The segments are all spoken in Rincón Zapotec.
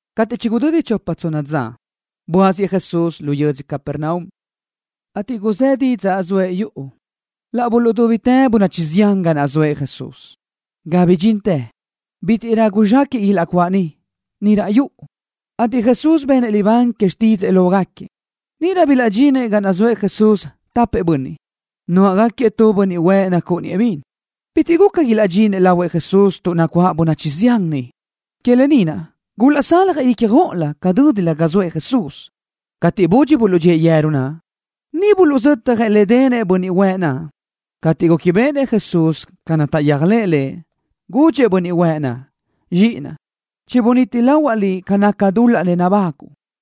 Cateʼ chigudödi chopa tsonna dza, buáziëʼ Jesús yödzö Capernaum, ateʼ guzë́ didzaʼ zoëʼ yuʼu. Laʼ buluʼdúbitë bönachi zián ga naʼ zoëʼ Jesús, ga bidxintë bítiʼrö guzxéquiʼ ilaʼcuáʼ niʼ, ni raʼ yuʼu, ateʼ Jesús benëʼ libán que xtídzëʼë lógaquiëʼ. Níʼirö bilaʼdxinëʼ ga naʼ zoëʼ Jesús tapëʼ bönniʼ, nuáʼagaquiëʼ tu bönniʼ huëʼ nacúʼuniëʼ bin. Bitiʼ guca ilaʼdxinëʼ lahuëʼ Jesús tuʼ nacuáʼ bönachi zián niʼ. Que lë ni naʼ gulaʼsaljëʼ ícjoʼolö ca dö́dilö ga zoëʼ Jesús. Cateʼ budxi buluʼdxíëʼ yeru naʼ, niʼ buluʼzötjëʼ le denëʼ bönniʼ huëʼ naʼ. Cateʼ gúquibeʼenëʼ Jesús ca naʼ taʼyéajlëʼë Lëʼ, gudxëʼ bönniʼ huëʼ naʼ: —Zxiʼinaʼ, chibunít lahuaʼ liʼ ca naca dul-laʼ nabáguʼu.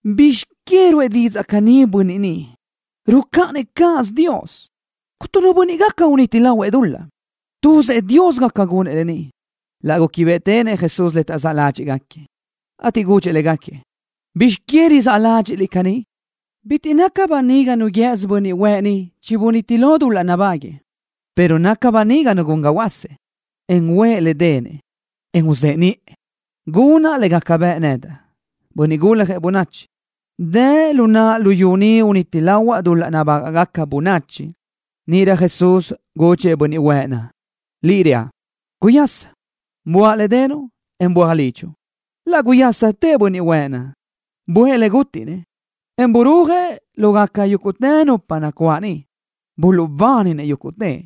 ¿Bizx que ruʼë caní didzaʼ bönniʼ ni? Rucáʼanëʼ cáʼasö Dios. Cuntu nu bönniʼ gaca uniti lahuëʼ dul-laʼ. Tuzëʼ Dios gaca gunëʼ lë ni. Laʼ gúquibeʼetenëʼ Jesús le taʼzáʼ ládxiʼgaquiëʼ, ateʼ gudxëʼ légaquiëʼ: —¿Bizx que rizáʼ ládxiʼliʼ caní? Bitiʼ naca böniga nu guië́sö bönniʼ huëʼ ni chibuníti lo dul-laʼ nabáguëʼë, pero naca böniga nu gun ga huöásëʼ, en uʼë le denëʼ, en uzëʼe niʼë. Gunaʼ le gaca bëʼ nedaʼ, Bönniʼ Guljëʼ Bönachi, dë lu naʼa luyú ni uniti lahuaʼ dul-laʼ nabágaʼgaca bönachi. Níʼirö Jesús gudxëʼ bönniʼ huëʼ naʼ: —Liʼ reaʼ: Guyasa. Buáʼ le denuʼ, en böaj lidxuʼ. Laʼ guyásatëʼ bönniʼ huëʼ naʼ, buʼë le gútiʼnëʼ, en burúajëʼ lógaca yúguʼtë nupa nacuáʼ niʼ. Buluʼbáninëʼ yúguʼtëʼ,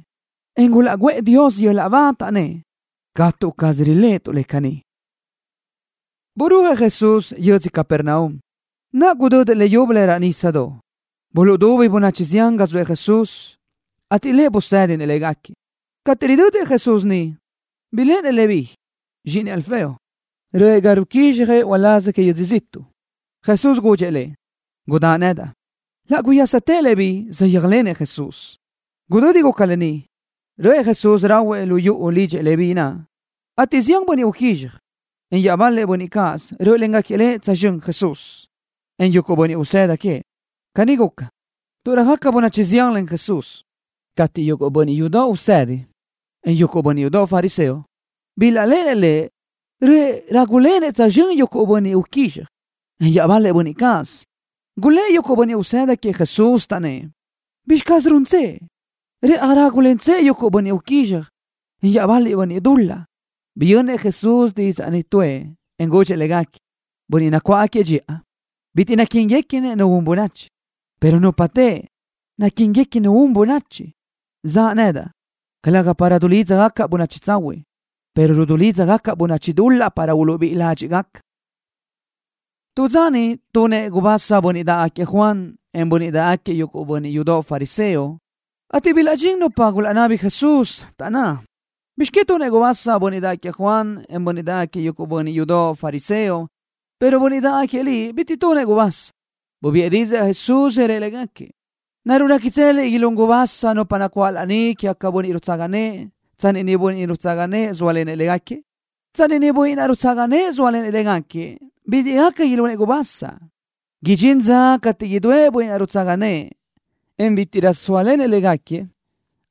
en gulaʼguʼë Dios yöl-laʼ ba, taʼnnë́ʼ: —Catu caz riléʼetuʼ le caní. Burúajëʼ Jesús yödzö Capernaum, naʼ gudödëʼ leyúbölö raʼ nísadoʼ. Buluʼdubi bönachi zián ga zoëʼ Jesús, ateʼ Lëʼ busédinëʼ légaquiëʼ. Cateʼ ridödëʼ Jesús niʼ, biléʼenëʼ Leví, zxíʼinëʼ Alfeo, röʼë ga ruquízxjëʼ uláz que yödzö ziʼtuʼ. Jesús gudxëʼ lëʼ: —Gudáʼ nedaʼ. Laʼ guyásatëʼ Leví naʼ, saʼyéajlenëʼ Jesús. Gudödi guca lë ni, röʼë Jesús rahuëʼ lu yuʼu lidxëʼ Leví naʼ, ateʼ zián bönniʼ uquízxaj, en iaʼbal-lëʼ bönniʼ cáʼasö rö́ʼölengaquiëʼ tsözxö́n Jesús, en yuguʼ bönniʼ usëda queëʼ. Caní guca, tuʼ röjaca bönachi zián len Jesús. Cateʼ yuguʼ bönniʼ yudoʼ usedi, en yuguʼ bönniʼ yudoʼ fariseo, bilaʼléʼenëʼ Lëʼ röʼë rágulenëʼ tsözxö́n yuguʼ bönniʼ uquízxaj, en iaʼbal-lëʼ bönniʼ cáʼasö, gulë́ʼ yuguʼ bönniʼ usëda queëʼ Jesús, taʼnnë́ʼ: —¿Bizxi caz runtsëʼ? ¡Rëʼaj rágulentsëʼ yuguʼ bönniʼ uquízxaj, en iaʼbal-lëʼ bönniʼ dul-laʼ! Biyönnëʼ Jesús didzaʼ ni tuʼë, en gudxëʼ légaquiëʼ: —Nupa nacuáʼ dxiʼa bitiʼ naquíniguequi nu un bönachi, pero nupa teʼe naquíniguequi nu un bönachi. Zaʼa nedaʼ, calëga dulídzagacaʼ bönachi tsahuiʼ, pero rulídzagacaʼ bönachi dul-laʼ para uluʼbíʼi ládxiʼgaca. Tu dza niʼ tunëʼ gubasa bönniʼ dáʼgaquiëʼ Juan, en bönniʼ dáʼgaquiëʼ yuguʼ bönniʼ yudoʼ fariseo, ateʼ bilaʼdxín nupa gulaʼnabi Jesús, taʼnná: —¿Bizx que tunëʼ gubasa bönniʼ dáʼgaquiëʼ Juan, en bönniʼ dáʼgaquiëʼ yuguʼ bönniʼ yudoʼ fariseo, pero bönniʼ dáʼgaquiëʼ Liʼ bitiʼ tunëʼ gubasa? Bubiʼë didzaʼ Jesús, rëʼ légaquiëʼ: —¿Naruʼ réquitseliʼ ilún gubasa nupa nacuáʼ laní queëʼ bönniʼ rutsaga nëʼë tsanni niʼ bönniʼ naʼ rutsaga nëʼë zóalenëʼ légaquiëʼ? Tsanni niʼ bönniʼ naʼ rutsaga nëʼë zóalenëʼ légaquiëʼ, bitiʼ gaca ilunëʼ gubasa. Idxín dza cateʼ udúëʼ bönniʼ naʼ rutsaga nëʼë, en bítiʼrö sóalenëʼ légaquiëʼ,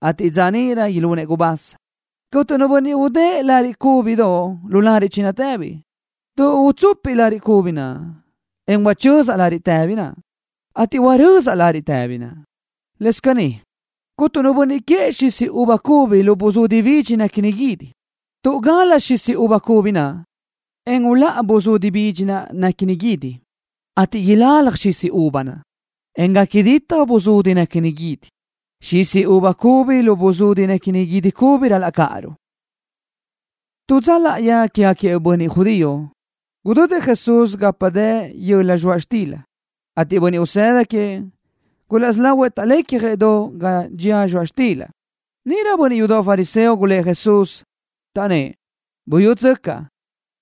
ateʼ dza níʼirö ilunëʼ gubasa. ’Cuntu nu bönniʼ udë́ʼë tu lariʼ cúbidoʼ lu lariʼ chinatëbi, tuʼ utsupiʼ lariʼ cubi naʼ, en huachözaʼ lariʼ tëbi naʼ, ateʼ huarö́zaʼrö lariʼ tëbi naʼ. Lëscaʼ caní cuntu nu bönniʼ quëʼë xisi uva cubi lu buzudi bidxi néquini guídi, tuʼ gal-la xisi uva cubi naʼ, en uláʼa buzudi bidxi naʼ néquini guídi, ateʼ ilalaj xisi uva naʼ, en gaca ditaj buzudi néquini guídi. Xisi uva cubi lu buzudi néquini guídi cubi ral-laʼ cáʼaruʼ. Tu dza láʼayi quégaquiëʼ bönniʼ judío, gudödëʼ Jesús gapa dë yöla zxoaʼ xtila, ateʼ bönniʼ usëda queëʼ gulaʼsí lógaquiëʼ taʼlecjëʼ do ga dxía zxoaʼ xtila. Níʼirö bönniʼ yudoʼ fariseo gulë́ʼ Jesús, taʼnnë́ʼ: —Buyútsöcaʼ.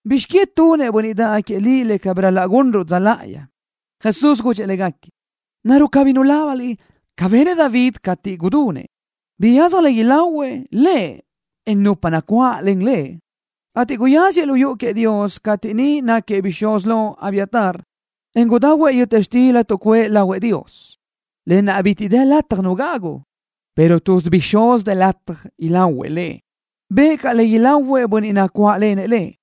¿Bizx que tunëʼ bönniʼ dáʼgaquiëʼ Liʼ le cabí ral-laʼ gunruʼ dza láʼayi? Jesús gudxëʼ légaquiëʼ: —¿Naruʼ cabí nulábaniliʼ ca benëʼ David cateʼ gudunëʼ? Biyadzaj le ilahuëʼ lëʼ, en nupa nacuáʼlen lëʼ ateʼ guyáziëʼ lu yuʼu queëʼ Dios cateʼ niʼ náquiëʼ bixúz lo Abiatar, en gudahuëʼ yöta xtila tuʼcuʼë lahuëʼ Dios, lë naʼ bitiʼ dë lataj nu gagu, pero tuz bixúz dë lataj ilahuëʼ le. Bëʼë caʼ le ilahuëʼ bönniʼ nacuáʼlenëʼ lëʼ.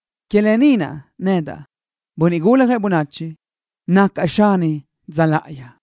Que lë ni naʼ, nedaʼ, Bönniʼ Guljëʼ Bönachi, nacaʼ Xani dza láʼayi.